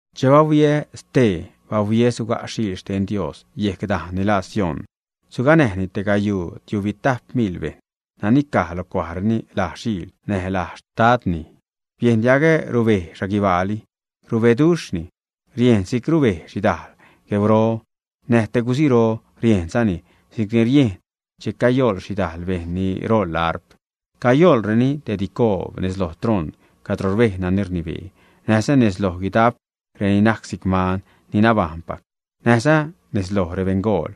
Che bahuiä stee, bahuiä suga' Xiil xten Dios yejc dajn ni laa Sión. Suganäjni te gayuu tiubitajp miḻ bejṉ nani caj lo cuajreni laj Xiil näj laj Xtadni. Biejn diagä rubej xhaguibaali, rubeduxh, riejnni si'c rubej xhidajl gueuro, näj te guziro; riejnzani si'cni riejn che cayoḻ xhidajl bejṉ ni roḻ arp. Cayoḻreni te dicoob nez loj troṉ cadro rbej nani rnibee, näjza nez loj guidap reni najc si'c man ni nabajṉpac, näjza nez loj rebeṉgool.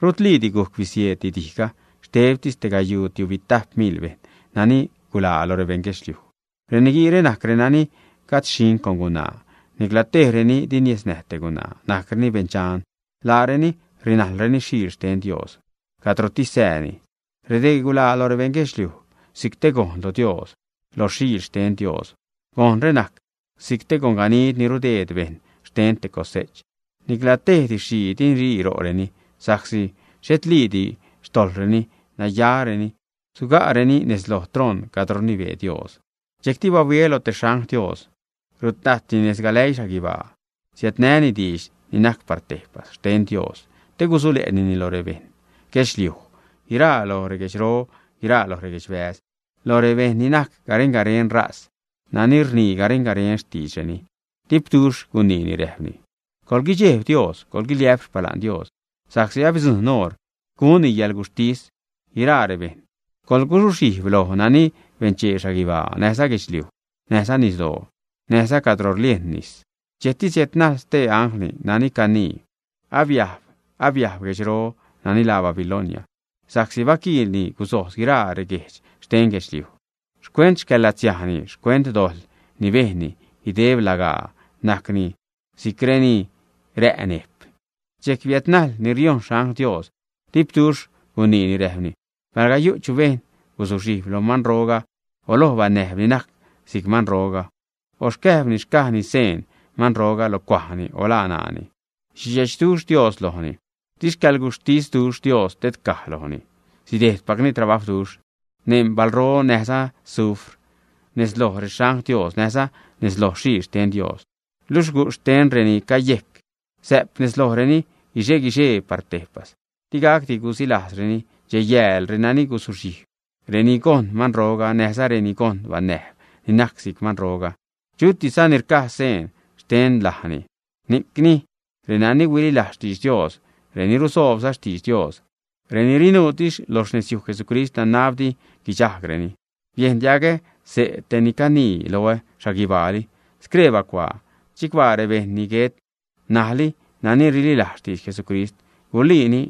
Rutliidi gujc bisieeddi dijga, xtebtis tegayuu tiubitajp miḻ bejṉ nani guḻaa lo rebeṉ guedxliuj. Reniguiire najc renani gajd xhiṉ con gunaa; nicla tejreni di niesnäj te gunaa, najcreni beṉ dxan. Laareni rinajlreni Xiil xten Dios cadrotis sääni. Redee guḻaa lo rebeṉ guedxliuj si'c te gojn lo Dios näjza lo Xiil xten Dios. Gojnre najc si'c gonganid ni rudeed bejṉ xten te cose'ch. Nicla tej didx-xhii di guirii ro'reni, sa'csi xhetliidi xtojḻreni, nayareni suga'reni nez loj troṉ cadro rnibee Dios. Dxejcti bahuiä loj stee xangl Dios, rutajtni nez galäii xhaguibaa, siädnäni diidx ni najc par tejpas xten Dios te gusule'nini loj rebeṉ guedxliuj, guiraa lo reguedxro, guiraa lo reguedxbäz, loj rebeṉ ni najc garen-garen ṟaz, nani rnii garen-garen xtiidreni. Dipduxh guniini, räjpni: ―Coḻguidxejb Dios, coḻguiliä'p xpala'n Dios sa'csi abidzujṉ oṟ gunni yäḻguxhtis guiraa rebejṉ. Coḻguzuxhijb loj nani benchee xhaguibaa, näjza guedxliuj, näjza nisdoo, näjza cadro rliejn nis. Dxejcti siädnajl stee angl nani canii: ―Abiajb, abiajb guejdxroga nani laa Babilonia, sa'csi baquiilni guzojz guiraa reguejdx xten guedxliuj xcuent xcäḻ-latsiajni, xcuent dojḻ ni bejnni guideb lagaa; najcni si'c reni rä' nejp. Dxejc biädnajl ni riojṉ xangl Dios, dipduxh guniini, Räjpni: ―Palga yu' chu bejṉ guzuxhijb loj manroga o loj banäjb ni najc si'c manroga, o xcäjbni xca'ni xseen manro lo cuajni o lo ṉaani, sidxechduxh Dios lojni, di xcäḻguxhtisduxh Dios tedcaj lojni. Sidejdpacni trabajwduxh neṉ balro näjza azufr nez loj rexangl Dios näjza nez loj Xiil xten Dios. Luxh gujxh xten reni cayejc sä'p nez lojreni guixe-guixee par tejpas. Digacdi gusilajzreni dxej-yääl, renani guzuxhijb, reni gojṉ manroga näjza reni gojṉ banäjb ni najc si'c manroga, chutisza ni rca' seen xten lajni. Ni'cni renani huililajz xtidx Dios, reni rusoobza xtidx Dios, ni rinuutis lo xnezyuj Jesucrist, nanab di guidxajgreni. Biejn diagä xse' te ni caniini loä xhaguibaali: ―Scree bacuaa: “Chicbaa rebejṉ ni guet ṉajli nani rililajz xtidx Jesucrist.” “Guliini”,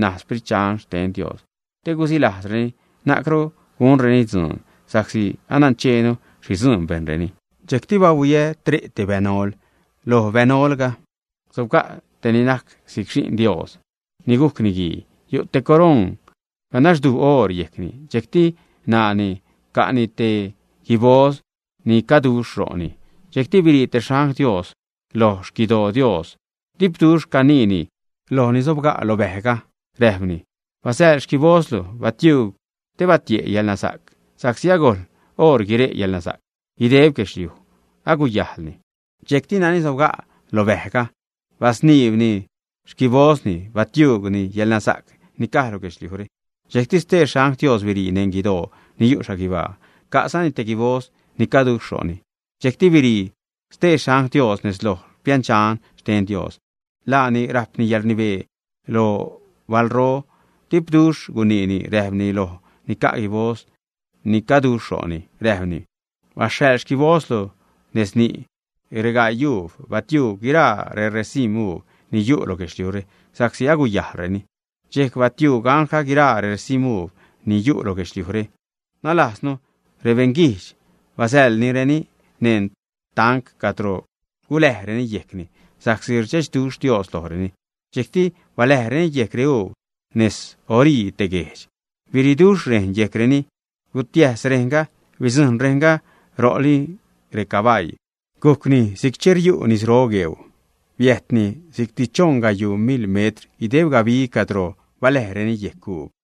naj Sprit Dxan xten Dios: “Te gusilajzreni, na'cru gunreni dzuun, sa'csi anancheenu xhi dzuun bejnreni.” Dxejcti bahuiä tre' te bänol, loj bänolga sobga' te ni najc si'c Xi'n Dios ni gujc Niguii. Yu' te coroṉ ganaxduj oor yejcni, dxejcti ṉaani ca'ni te guiboz ni caduxh ro'ni. Dxejcti birii te xangl Dios loj xquidoo Dios, dipduxh caniini loj ni sobga' loj bäjga, räjpni: ―Basäḻ xquibozlu, batiuug, te batie' yäḻnasa'c, sa'csi agojl oṟ guire' yäḻnasa'c, guideb guedxliuj aguyajḻni. Dxejcti nani sobga' lo bäjga basniibni xquibozni, batiuugni yäḻnasa'c ni caj lo guedxliujre. Dxejcti stee xangl Dios birii neṉ guidoo ni yu' xhaguibaa, ca'zani te guiboz ni caduxh ro'ni. Dxejcti birii stee xangl Dios nez loj piändxan xten Dios. Laani rajpni yäḻrnibee lo balro. Dipduxh guniini, räjpni loj ni ca' guiboz ni caduxh ro'ni, räjpni: ―Basäḻ xquibozlu nez ni' reyaguub, batiuug guiraa reresim̲ uub ni yu' lo guedxliujre, sa'csi aguyajlreni. Dxejc batiuug anglga guiraa reresim̲ uub ni yu' lo guedxliujre nalajznu rebeṉguijdx, basäḻnireni neṉ tanc cadro guläjreni yejcni sa'csi rdxechduxh Dios lojreni. Dxejcti baläjreni yejc reuub nez orii te guejdx. Biriiduxh rejn yejcreni, gutiäs rejnga, bidzujṉ rejnga ro'li recabaii, gujcni si'c che riu' nisro gueuu, biäjtni si'cti choṉ gayuu mil metr guideb gabi cadro baläjreni yejc reuub.